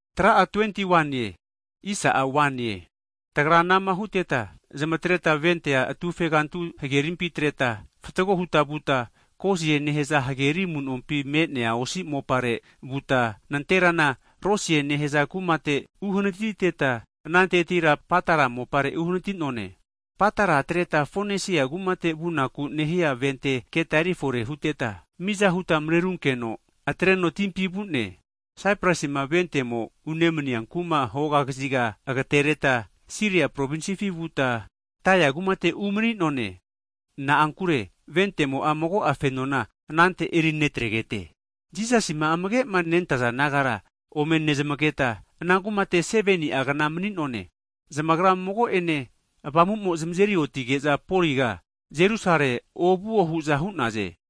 Hagi Tagra anama huteta, zamatreta ventea atufegantu hagerimpi atreta fatgo huta vuta, Kosie nehaza hageri amunompi me'nea osi mopare (ailen) vuta, nanterana Rodesie nehaza kumate (ailen) uhanatiteta, anantetira Patara mopare uhanati'none. Patara atreta, Fonesia kumate vunaku nehia vente keta eri fore huteta, miza huta marerunkeno atreno timpi vu'ne. Saiprusima ventemo unemania kumara hoga kaziga agatereta, Siria Provinsifi vuta, Tairi kumate umani'none. Na'ankure ventemo'a mago'a fenona anante eri netregete. Jisasima amage'ma nentaza disaipol nagara ome nezmageta, ana kumate 7ni'a kna mani'none. Zamagra mago'ene Avamu'mo zamazeri otige'za Poliga Jerusalemi ovuo hu'za hu'naze.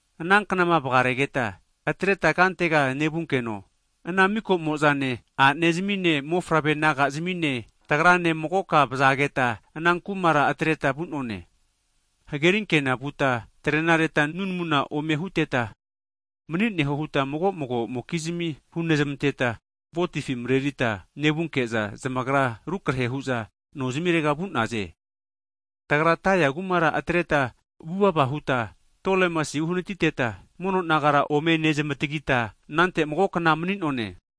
Ananknama vagaregeta, atreta kantega nevunkeno, ana mika'mo'zane, a'nezamine, mofavre naga'zamine tagrane magoka vazageta ana kumara atreta vu'none. Hagerinkenare vuteta tarenareta nunamuna ome huteta, mani'neho huta mago mago'mokizmia hunezmanteta ventefi marerita nevunke'za, zamagra rukrahe hu'za nozimirega vu'naze. Tagra Tairi kumara atreta vuva vuva huta Tolemais uhanatiteta, mono nagara ome nezmatagita anante magokna mani'none.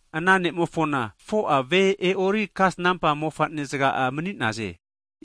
Ana ne'mofona 4'a ve e'ori kasnampa mofane'zaga'a mani'naze.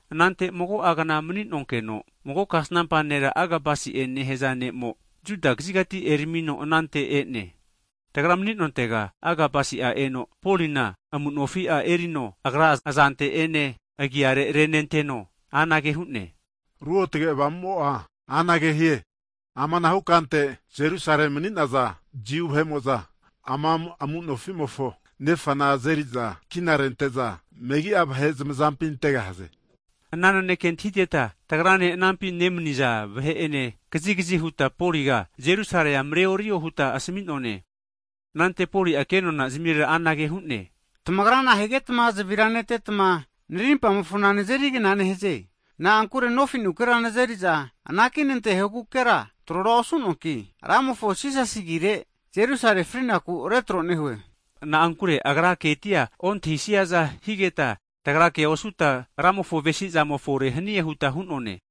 Anante mago'a kna mani'nonkeno, mago kasnampa nera Agabusi'e nehaza ne'mo, Judia kazigati eramino anante e'ne. Tagra mani'nontega Agabusi'a eno, Polina amu'nofi'a (belt) erino agra azante ene agiare renenteno anage hu'ne, Ruotge Avamu'mo'a anage hie, Amanahu kante Jerusalemi mani'naza Jiu vahe'mo'za ama amu'nofi'mofo nefana azeri'za kina rente'za megi'a vahe zamazampi antegahaze. Ana naneke antahiteta, tagrane anampi nemani'za vahe'ene kazigazi huta, Poliga Jerusalea mareorio huta asami'none. Anante Poli'a kenona zamirera anage hu'ne, tamagra nahigetma zavira netetma, narimpamofona nazeri kna nehaze? Na'ankure nofinukera nazeriza anaki nantehogukera trora osuanki, Ramofo Jisasi agire Jerusalemi frinaku retro nehue. Na'ankure agra ketia ontahisiaza higeta, tagra kea osuta Ramofo avesi'zamo fore hanie huta hu'none.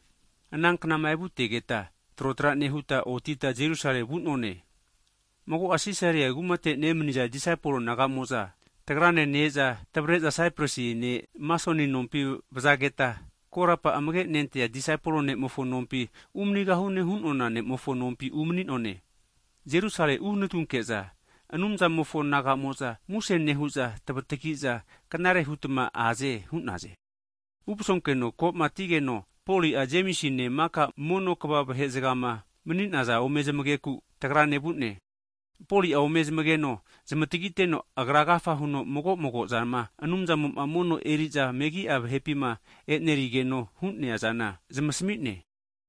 Ana knama evutegeta trotra nehuta otita Jerusalemi vu'none. Mago'a Sisaria kumate nemaniza disaipol naga'mo'za tagrane ne-eza tavare'za Saiprusi ne' Masoni nompi vazageta, korapa Jisasi amage nentea disaipol ne'mofo nompi umanigahune hu'nona ne'mofo nompi umani'none. Jerusalemi uhanatunke'za Anumzamofo naga'mo'za muse nehu'za tavatagi'za knare hutma aze hu'naze. Uvasonkeno ko'ma atigeno, Poli'a, Jemisine maka mono kva vahe'zagama (eldas) mani'naza ome zamagenaku tagrane vu'ne. Poli'a ome zamageno zamatagiteno, agra agafa huno mago' mago'zama Anumzamo'ma mono eri'za megi'a vahepima e'nerigeno hu'neazana zamasmi'ne.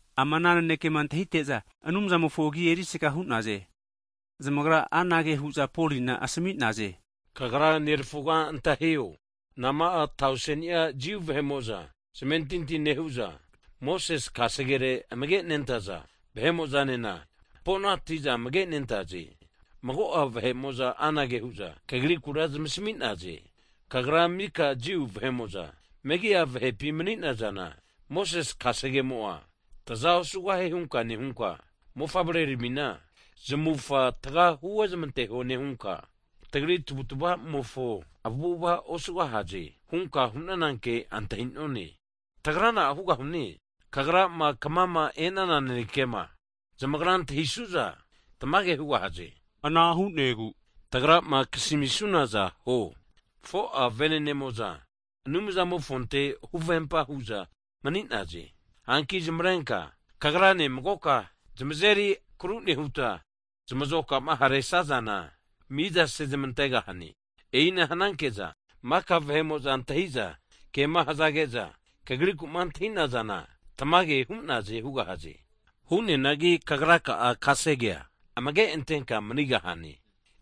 Ama ana nanekema antahite'za, Anumzamofo agi erisaga hu'naze. Zamagra anage hu'za Polina asami'naze, kagra nerafuga antahio, nama'a tauseni'a Jiu vahe'mo'za zamentinti nehu'za, Mosese Kasege'ne amage' nentaza vahe'mo'zanena hampo'nati'za amage' nentaze. Mago'a vahe'mo'za anage hu'za kagrikura zamasmi'naze, kagra maka Jiu vahe'mo'za megi'a vahepi mani'nazana, Mosese kasegemo'a taza osugahie hunka nehunka, mofavreramina zamufa taga huozmanteho nehunka, tagri tavutavamofo avu'avara osugahaze hunka hu'nananke antahi'none. Tagra na'a hugahune? Kagrama kmama e'nana nanekema zamagra antahisu'za tamage hugahaze. Ana hu'negu tagrama kasmisunaza huo. 4'a vene'nemo'za Anumzamofonte huvempa hu'za mani'naze. Hanki zamavarenka kagrane magoka tamazeri agru nehutma, zamazoka'ma haresazazana miza sezmantegahane. E'ina hananke'za, maka vahe'mo'za antahi'za kema hazage'za kagriku'ma antahi'nazana tamage hu'naze hugahaze. Hu'neanagi kagraka'a kasegea amage antenka manigahane.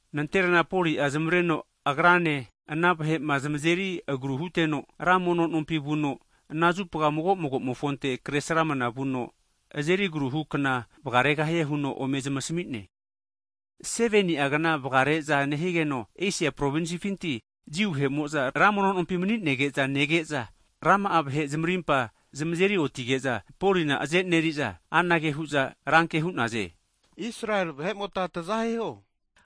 Nanterana Poli'a zamavareno agrane ana vahe'ma zamazeri agru huteno, ra mono nompi vuno, ana zupa mago mago'mofonte Kresramana vuno azeri agaruhu kna vagaregahie huno ome zamasmi'ne. Hagi 7ni'a kna vagare'za nehigeno, Esia provinsifinti Jiu vahe'mo'za ra mono nompi mani'nege'za nege'za, rama'a vahe zamarimpa zamazeri oti'zage'za Polina azeneri'za, anage hu'za ranke hu'naze, Israeli vahe'mote taza hiho!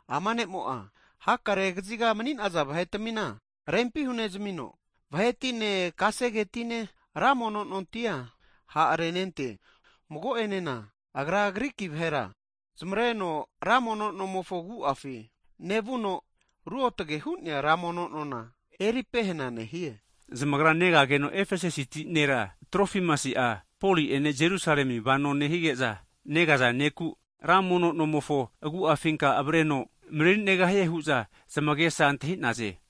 Ama ne'mo'a hakare kaziga mani'naza vahetamina rempi hunezmino, vahetine kasegetine, ra mono nontia ha' renente! Mago'enena agra Griki vahera zamareno ra mono nomofo agu'afi nevuno, ruotage hu'nea ra mono nona eri pehena nehie! Zamagra negageno Efesasiti nera Trofimusi'a, Poli'ene Jerusalemi vano nehige'za negaza ne'ku, ra mono nomofo agu'afinka avreno marerinegahie hu'za zamagesa antahi'naze.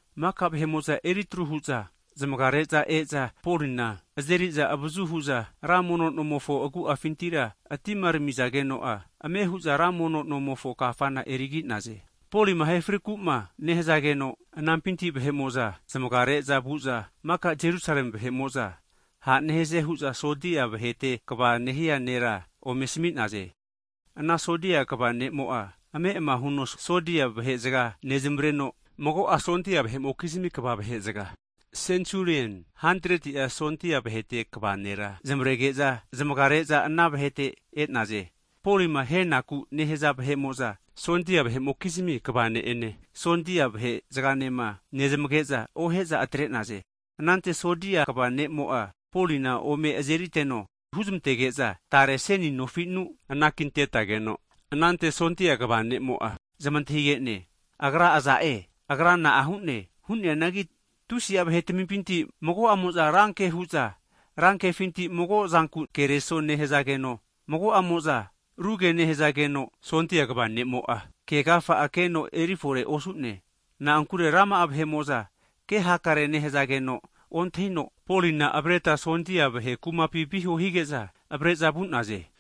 Maka vahe'mo'za eritru hu'za zamaga re'za e'za, Polina azeri'za avazu hu'za ra mono nomofo agu'afinti atimaneramizageno'a, ame hu'za ra mono nonkafana erigi'naze. Polima ahe friku'ma nehazageno, anampinti vahe'mo'za zamaga re'za vu'za, maka Jerusalemi vahe'mo'za ha' nehaze hu'za sondia vahete kva nehia nera ome asmi'naze. Ana sondia kva ne'mo'a ame' huno sondia vahe'zaga nezmareno, mago'a vahe'mokizmi kva vahe'zaga (sensulien, hantretia sondia vahete kva nera) zamarege'za, zamaga re'za ana vahete e'naze. Polima ahenaku nehaza vahe'mo'za, sondia vahe'mokizmi kva ne'ene, sondia vahe'zagama nezamage'za, ohe'za atre'naze. Anante sondia kva ne'mo'a Polina ome azeriteno, huzmantege'za tare seni nofinu anakintetageno, anante sondia kva ne'mo'a, zamantahige'ne, Agra aza'e, agra na'a hu'ne? Hu'neanagi tusi'a vahetamimpinti mago'amo'za ranke hu'za ra kefinti mago zanku kereso nehazageno, mago'amo'za ruge nehazageno, sondia kva ne'mo'a ke agafa'a keno eri fore osu'ne. Na'ankure rama'a vahe'mo'za kehakare nehazageno ontahino, Polina avareta sondia vahe kumapi viho hige'za avare'za vu'naze.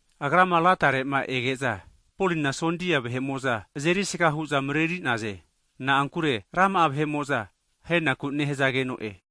Agrama latare'ma ege'za, Polina sondia vahe'mo'za azerisga hu'za mareri'naze. Na'ankure rama'a vahe'mo'za ahenaku nehazageno'e.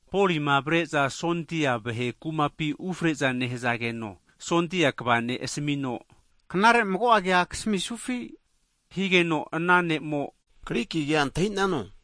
Polima avare'za sondia vahe kumapi ufre'za nehazageno sondia kva ne' asamino, Knare mago'a kea kasmisufi? Higeno ana ne'mo, Griki kea antahi'nano? huno Polina antahige'ne.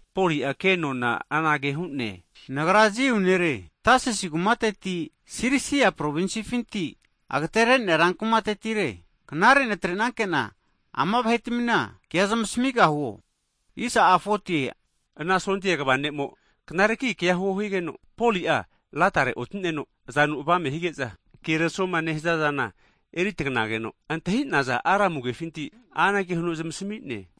Poli'a kenona anage hu'ne, Nagra Jiu nere Tasisi kumateti Sirisia provinsfinti, agatere'nea rankumatetire. Knare natre'nanke'na ama vahetamina kea zamasmigahuo higeno, ana sondia kva ne'mo'a knareki kea huo higeno, Poli'a latare oti'neno azanu avame hige'za keresoma nehazazana eri taganageno, antahi'naza Aramu (Hibru) kefinti, anage huno zamasmi'ne.